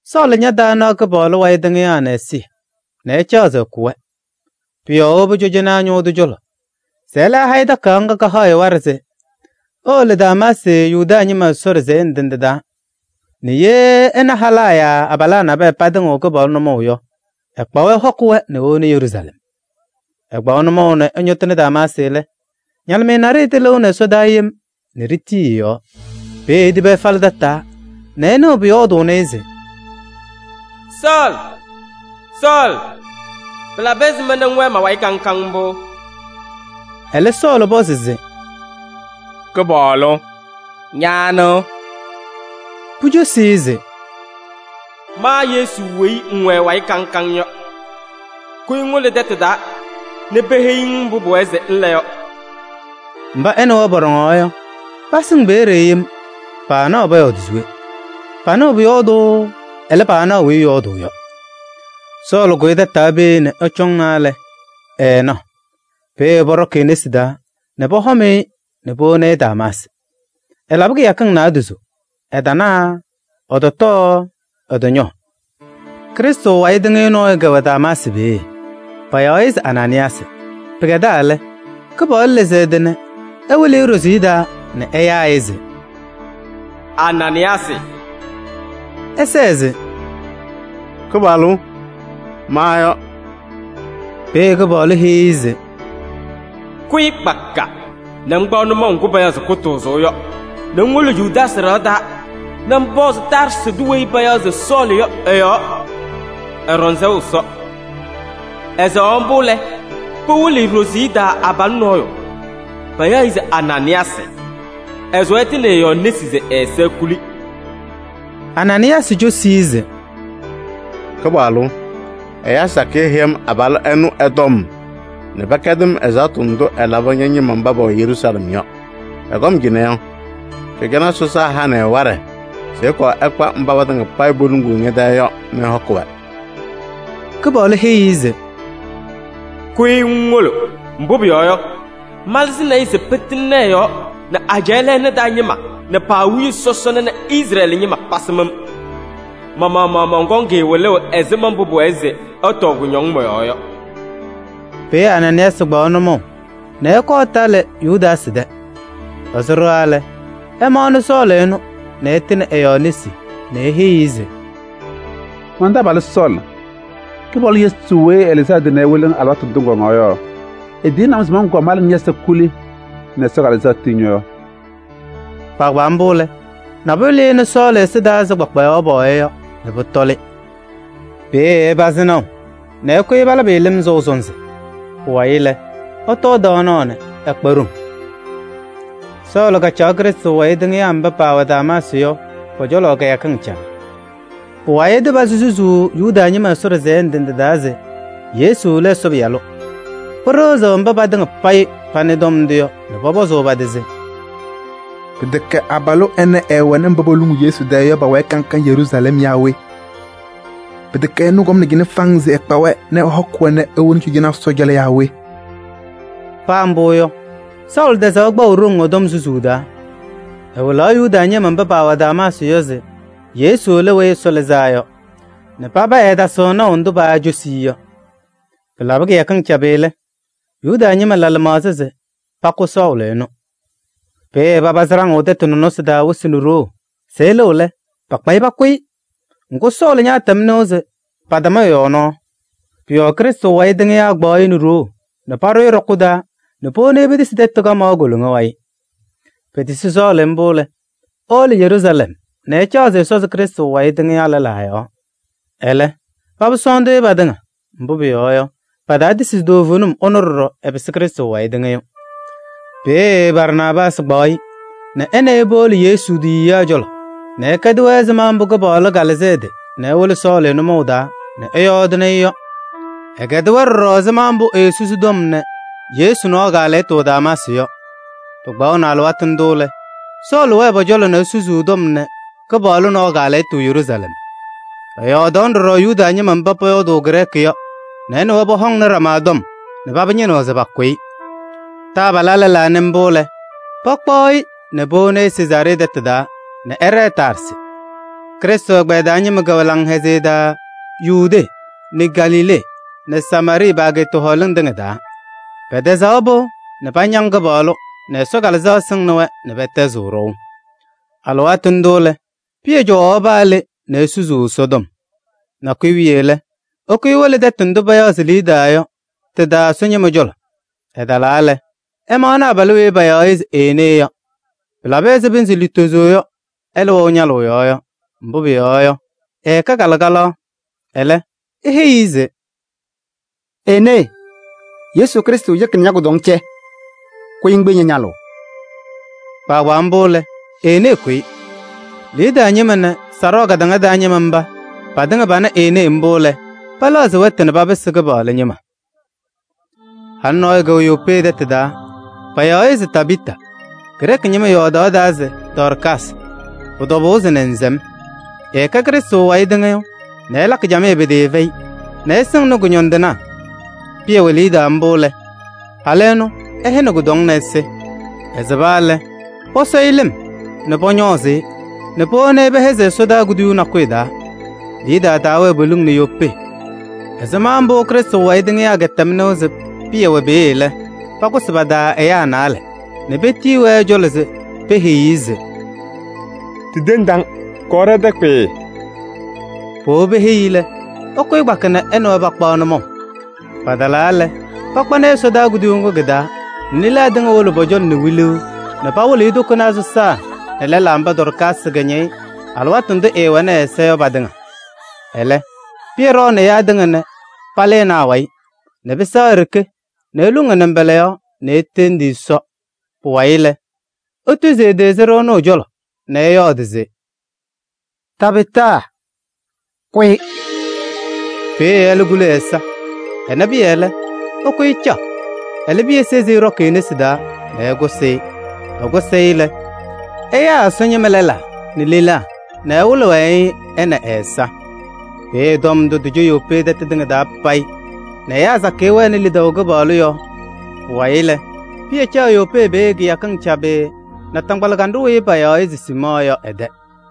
Sɔɔlɩ ñataanaɣ Kɩpaɣlʋ wayɩ tɩŋɩyaa nɛ ɛzɩyɛ nɛ ɛcaɣ se ɛkʋ-wɛ. Pʋ-yɔɔ ewobi cɔjɔnaa ñʋʋ tʋ cɔlɔ se ɛlɛ ɛha-ɩ takayaɣ ŋga kahaɣ-ɩ waɖɛ se ewolo Damaasɩ Yuda ñɩma Ɛsɔ ɖɩsɛyɛ ndɩ ndɩ taa nɛ ye ɛna halaa yaa abalaa nabɛyɛ patɩŋɩɣ Kɩpaɣlʋ nʋmɔʋ yɔ, ɛkpa-wɛ ɛhɔkɩ-wɛ nɛ ewoni Yeruusalɛm. Ɛkpaɣ nʋmɔʋ nɛ ɛñɔtɩnɩ Damaasɩ lɛ, ñalɩmɩyɛ naɖɩyɛ tɩlɩʋnɩ ɛsɔdaa yem nɛ ɖitii ɛ-yɔɔ. Peeye etibi ɛfalɩ tataa nɛ ɛnɩɣ pʋyɔɔdʋʋnɩ-ɩ se: “Sɔɔlɩ! Sɔɔlɩ! Pɩlabɩ ɛzɩma nɛ ŋwɛɛ ma-wayɩ kaŋ kaŋ mbʋ?” Ɛlɛ Sɔɔlɩ pɔzɩ se: “Kɩpaɣlʋ! Ña anɩ?” Pucosi-i se: “Ma Yesu weyi ŋwɛ ɛ-wayɩ kaŋ kaŋ yɔ. Kʋyɩ ŋwolo tɛtʋ taa nɛ peheyi-ŋ mbʋ pʋwɛɛ se ŋla yɔ.” Mba ɛ nɛ wɛ pɔɖɔŋaɣ yɔ, pasɩŋ pe-ɖeɖe yem, paanaɣ pɔyɔɔdɩ se we: panɩɣ pʋyɔɔdʋʋ, ɛlɛ, paanaɣ weyi ɛyɔɔdʋʋ yɔ. Sɔɔlɩ kʋyɩ tataa peeye nɛ ɛcɔŋna lɛ, ɛɛnaɣ. Peeye pɔɖɔkɩ e-nesi taa nɛ pɔhɔm-ɩ nɛ powoni Damaasɩ. Ɛlabɩ kɩyakɩŋ naadozo, ɛtana, ɛtɔtɔɔ, ɛtɔñɔɔ. Krɩstʋ wayɩ tɩŋɩyʋ nɔɔyʋ kɛwɛ Damaasɩ peeye, payaɣ-ɩ se Anaanɩyaasɩ. Pɩkɛdaa lɛ, Kɩpaɣlʋ lɩzɩ ɛ-tɩ nɛ ɛwɩlɩ-ɩ ɖoziye taa nɛ ɛyaa-ɩ se: “Anaanɩyaasɩ!” Ɛlɛ ɛsɛɛ se: “Kɩpaɣlʋ! Ma yɔ.” Peeye Kɩpaɣlʋ heyi-i se: “Kʋyɩ kpaka nɛ ŋkpaɣ nʋmɔʋ ŋgʋ payaɣ se Kʋtʋʋzʋʋ yɔ nɛ ŋwolo Yudaasɩ ɖɩɣa taa nɛ ŋpɔzɩ Taarsɩ tʋ weyi payaɣ se Sɔɔlɩ yɔ ɛ-yɔɔ, ɛɖɔŋ sɛʋ Ɛsɔ. Ɛsɛɣaɣ mbʋ lɛ, pɩwɩlɩ-ɩ ɖoziye taa abalʋ nɔɔyʋ, payaɣ-ɩ se Anaanɩyaasɩ, ɛsʋwa ɛtɩnɩ ɛ-yɔɔ nesi se ɛ-ɛza ekuli.” Anaanɩyaasɩ cosi-i se: “Kɩpaɣlʋ! Ɛyaa sakɩyɛ heyi-m abalʋ ɛnʋ ɛ-tɔm nɛ pɛkɛdɩ-m ɛzaɣtʋ ndʋ ɛlabɩ ña-ñɩma mba pɛwɛ Yeruusalɛm yɔ. Ɛkɔm cɩnɛ yɔ, cɔjɔnaa sɔsaa hanɩ-ɩ waɖɛ se ɛkɔɔ ɛkpa mba patɩŋa payɩ poluŋuu ñɛ-tɛɛ yɔ nɛ ɛhɔkɩ-wɛ.” Ɛlɛ, Kɩpaɣlʋ heyi-i se: “Kʋyɩ ŋwolo, mbʋ pʋyɔɔ yɔ, malɩzɩnɩ-ɩ se pɩtɩŋnɩ ɛ-yɔɔ nɛ ajɛɛ lɛɛna taa ñɩma nɛ pa-awiya sɔsɔna nɛ Izrɛɛlɩ ñɩma pasɩm-m. Ma-maɣmaɣ mɔnkɔŋ-ɩ wɩlʋʋ ɛzɩma mbʋ pʋwɛɛ se ɛtɔɔ kʋñɔŋ mɔ-yɔɔ yɔ.” Peeye Anaanɩyaasɩ kpaɣ nʋmɔʋ nɛ ɛkɔɔ ɛtalɩ Yudaasɩ tɛ. Ɛsʋ ɖɩɣa lɛ, ɛmaɣnɩ Sɔɔlɩ ɛnʋ nɛ ɛtɩnɩ ɛ-yɔɔ nesi nɛ eheyi-i se: “Man-taabalʋ Sɔɔlɩ! Kɩpaɣlʋ Yesu weyi ɛlɩzɩ ɛ-tɩ nɛ ɛwɩlɩ-ŋ alɩwaatʋ ndʋ ŋkɔŋaɣ yɔ, etiyini-m se mɔnkɔɔ mala nɛ ñɛ-ɛza kuli nɛ Ɛsɔ Kalɩzaɣ tii ñɔ-yɔɔ.” Kpaagbaa mbʋ lɛ, nabʋyʋ lɩnɩ Sɔɔlɩ ɛza taa ɛzɩ kpakpayaɣ pɔɔya yɔ nɛ pʋtɔlɩ. Peeye ɛpazɩ naʋ nɛ ɛkʋyɩ nɛ palabɩ-ɩ lɩm sɔʋ sɔnzɩ. Pʋwayɩ lɛ, ɛtɔɔ tɔɔnaɣ nɛ ɛkpa ɖoŋ. Sɔɔlɩ susuu Ɛsɔtɔm Damaasɩ yɔ Sɔɔlɩ kacaɣ Krɩstʋ wayɩ tɩŋɩyaa mba pɛwɛ Damaasɩ yɔ pɔ-cɔlɔ kɩyakɩŋ cabɩ. Pʋwayɩ ɛtɩpazɩ susuu Yuda ñɩma Ɛsɔ ɖɩsɛyɛ ndɩ ndɩ taa se Yesu lɛ Ɛsɔ Pɩyalʋ. Pɩɩɖɩɣzɩ mba patɩŋa panɩ ɛ-tɔm ndʋ yɔ nɛ pɔpɔzʋʋ pa-tɩ se: “Pɩtɛkɛ abalʋ ɛnɛ ɛɛwɛnɩ mba poluŋuu Yesu tɛɛ yɔ pa-wayɩ kaŋ kaŋ Yeruusalɛm yaa we? Pɩtɛkɛ ɛnʋ kɔmnɩ cɩnɛ faŋŋ se ɛkpa-wɛ nɛ ɛhɔkɩ-wɛ nɛ ewoni cɔjɔnaa sɔsaa cɔlɔ yaa we?” Paa mbʋ yɔ, Sɔɔlɩ tɛzaɣ kpaʋ ɖoŋ ɛ-tɔm susuu taa: ɛwɩlaɣ Yuda ñɩma mba paawɛ Damaasɩ yɔ se Yesu lɛ Weyi Ɛsɔ Lɩzaa Yɔ nɛ paba ɛɛtasɩɣ naʋ ndʋ paacosi-i yɔ. Pɩlabɩ kɩyakɩŋ cabɩ lɛ, Yuda ñɩma la lɩmaɣza se pakʋ Sɔɔlɩ ɛnʋ. Peeye papazɩ ɖaŋʋʋ tɛtʋ nɔnɔsɩ taa wɩsɩ nɛ ɖoo se ɛlɩɣ lɛ, pakpa-ɩ pakʋ-ɩ. Ŋgʋ, Sɔɔlɩ ñaatɛm nɩʋ se patam ɛ-yɔɔ nɔɔ. Pʋ-yɔɔ Krɩstʋ wayɩ tɩŋɩyaa kpaɣ-ɩ nɛ ɖoo nɛ paɖʋ ɖɔkʋ taa nɛ powoni-i petisi tɛtʋ kamaɣ koloŋa wayɩ. Petisi Sɔɔlɩ mbʋ lɛ, ewolo Yeruusalɛm nɛ ɛcaɣ se ɛsɔzɩ Krɩstʋ wayɩ tɩŋyaa lɛlaa yɔɔ, ɛlɛ, paba sɔɔndʋʋ-ɩ patɩŋa. Mbʋ pʋyɔɔ yɔ, pataatisi se toovenim ɛnʋ ɖɔɖɔ ɛpɩsɩ Krɩstʋ wayɩ tɩŋɩyʋ. Peeye Barnaabaasɩ kpaɣ-ɩ nɛ ɛ nɛ ɩ powolo Yesu tiyiyaa cɔlɔ nɛ ɛkɛdɩ-wɛ ɛzɩma mbʋ Kɩpaɣlʋ kalɩzɩ ɛ-tɩ nɛ ɛwɩlɩ Sɔɔlɩ nʋmɔʋ taa nɛ ɛyɔɔdɩnɩ-ɩ yɔ. Ɛkɛdɩ-wɛ ɖɔɖɔ ɛzɩma mbʋ eesusi tɔm nɛ Yesu nɔɔ kaalɛyɩtʋ Damaasɩ yɔ. Pɩkpaɣnɩ alɩwaatʋ ndʋ lɛ, Sɔɔlɩ wɛɛ pɔ-cɔlɔ nɛ esusuu tɔm nɛ Kɩpaɣlʋ nɔɔ kaalɛyɩtʋ Yeruusalɛm. Ɛyɔɔdaɣnɩ ɖɔɖɔ Yuda ñɩma mba pɔyɔɔdʋʋ Grɛɛkɩ yɔ nɛ ɛ nɛ wɛ pɔhɔŋnɩ ɖama tɔm nɛ paba ñɩnɩɣ se pakʋ-ɩ. Taabalaa lɛlaa nɩ mbʋ lɛ, pakpaɣ-ɩ nɛ powoni Sezaaree tɛtʋ taa nɛ ɛɖɛɛ Taarsɩ. Krɩstʋ ɛgbɛyɛ taa ñɩma kɛwɛ laŋhɛzɩyɛ taa Yudee nɛ Galilee nɛ Samaarɩɩ pa-ageeta hɔɔlɩŋ tɩŋa taa. Pɛtɛzaɣ pɩʋ nɛ pañaŋ Kɩpaɣlʋ nɛ Ɛsɔ Kalɩzaɣ sɩŋnɩ-wɛ nɛ pɛtɛzɩɣ ɖɔʋ. Alɩwaatʋ ndʋ lɛ, Pɩyɛ cɔwaɣ paa le nɛ esusuu Ɛsɔtɔm. Nakʋyʋ wiye lɛ, ɛkʋyɩ ewolo tɛtʋ ndʋ payaɣ se Liidaa yɔ tɩ-taa Ɛsɔ ñɩma cɔlɔ. Ɛtalaa lɛ, ɛmaɣnɩ abalʋ weyi payaɣ se Enee yɔ, pɩlabɩ pɩnzɩ lutozo yɔ ɛlɛ wɛʋ ñalʋʋ yɔɔ yɔ, mbʋ pʋyɔɔ yɔ, ɛkɛ kalɩkalaɣ. Ɛlɛ eheyi-i se: “Enee! Yesu Krɩstʋ yeki nɛ ña-kʋdɔŋ cɛ, kʋyɩ ŋkpiyi ña-ñalʋʋ.” Kpaagbaa mbʋ lɛ, Enee kʋyɩ. Liidaa ñɩma nɛ Sarɔɔ kataŋa taa ñɩma mba patɩŋa pana Enee mbʋ lɛ, pɛlɛɣzɩ wɛtʋ nɛ papɩsɩ Kɩpaɣlʋ ñɩma. Halʋ nɔɔyʋ kɛwɛ Yopee tɛtʋ taa, payaɣ-ɩ se Tabɩɩta, Grɛɛkɩ ñɩma yɔɔdaɣ taa se: “Dɔɔrkaasɩ.” Pʋ-tɔbʋʋ se nɛnzɛm. Ɛɛkɛ Krɩstʋ wayɩ tɩŋɩyʋ nɛ ɛlakɩ camɩyɛ pɩtɩɩfɛyɩ nɛ ɛsɩŋnɩ kʋñɔndɩnaa. Pɩyɛ wɛ Liidaa mbʋ lɛ, halʋ ɛnʋ ɛhɛnɩ kʋdɔŋ nɛ ɛsɩ. Ɛsɩba lɛ, pɔsɔ-ɩ lɩm nɛ pɔñɔɔzɩ-ɩ nɛ powoni pɛhɛzɩ ɛsɔdaa kuduyuu nakʋyʋ taa. Liidaa taawɛɛ poliŋ nɛ Yopee. Ɛzɩma mbʋ Krɩstʋ wayɩ tɩŋɩyaa kɛtɛm nɩʋ se Pɩyɛ wɛ peeye lɛ, pakʋsɩ pa-taa ɛyaa naalɛ nɛ petiyi-wɛ ɛ-cɔlɔ se peheyi-i se: “Ɖitendi-ŋ, kɔɔ ɖɛ-tɛ kpɩɩɩ.” Powobi peheyi-i lɛ, ɛkʋyɩ kpaka nɛ ɛ nɛ wɛ pakpaɣ nʋmɔʋ. Patalaa lɛ, pakpanɩ-ɩ ɛsɔdaa kuduyuu ŋgʋ kɩ-taa nɛ lelaa tɩŋa wolo pɔ-cɔlɔ nɛ wiluu nɛ pawɩlɩɣ-ɩ tokonaa sɔsaa nɛ lɛlaa mba Dɔɔrkaasɩ kɛñɛyɩ alɩwaatʋ ndʋ ɛɛwɛnɩ ɛ-ɛza yɔ patɩŋa. Ɛlɛ Pɩyɛ ɖɔɔnɩ ɛyaa tɩŋa nɛ palɩnɩ awayɩ nɛ pɩsɛɣ e-ɖeke nɛ eluŋ ɛ-nɩmbɔla yɔɔ nɛ etendi Ɛsɔ. Pʋwayɩ lɛ, etuzi ɛ-tɩ sɩɖʋ ɛnʋ ɛ-cɔlɔ nɛ ɛyɔɔdɩ se: “Tabɩɩta! Kʋyɩ!” Peeye ɛlɛ kuli ɛ-ɛza. Ɛna Pɩyɛ lɛ, ɛkʋyɩ ɛcaɣ. Ɛlɛ Pɩyɛ sezi ɛɖɔkɩ e-nesi taa nɛ ɛkʋsɩ-ɩ. Ɛkʋsɩ-ɩ lɛ, ɛyaa Ɛsɔ ñɩma lɛlaa nɛ lelaa nɛ ɛwɩlɩ-wɛ-ɩ, ɛ nɛ ɛ-ɛza. Peeye tɔm ndʋ tɩcɔ Yopee tɛtʋ tɩŋa payɩ nɛ ɛyaa sakɩyɛ wɛnɩ lidaʋ Kɩpaɣlʋ yɔɔ. Pʋwayɩ lɛ, Pɩyɛ caɣ Yopee peeye kɩyakɩŋ cabɩ naataŋgbala kanɖʋ weyi payaɣ se Siimɔɔ yɔ ɛ-tɛ.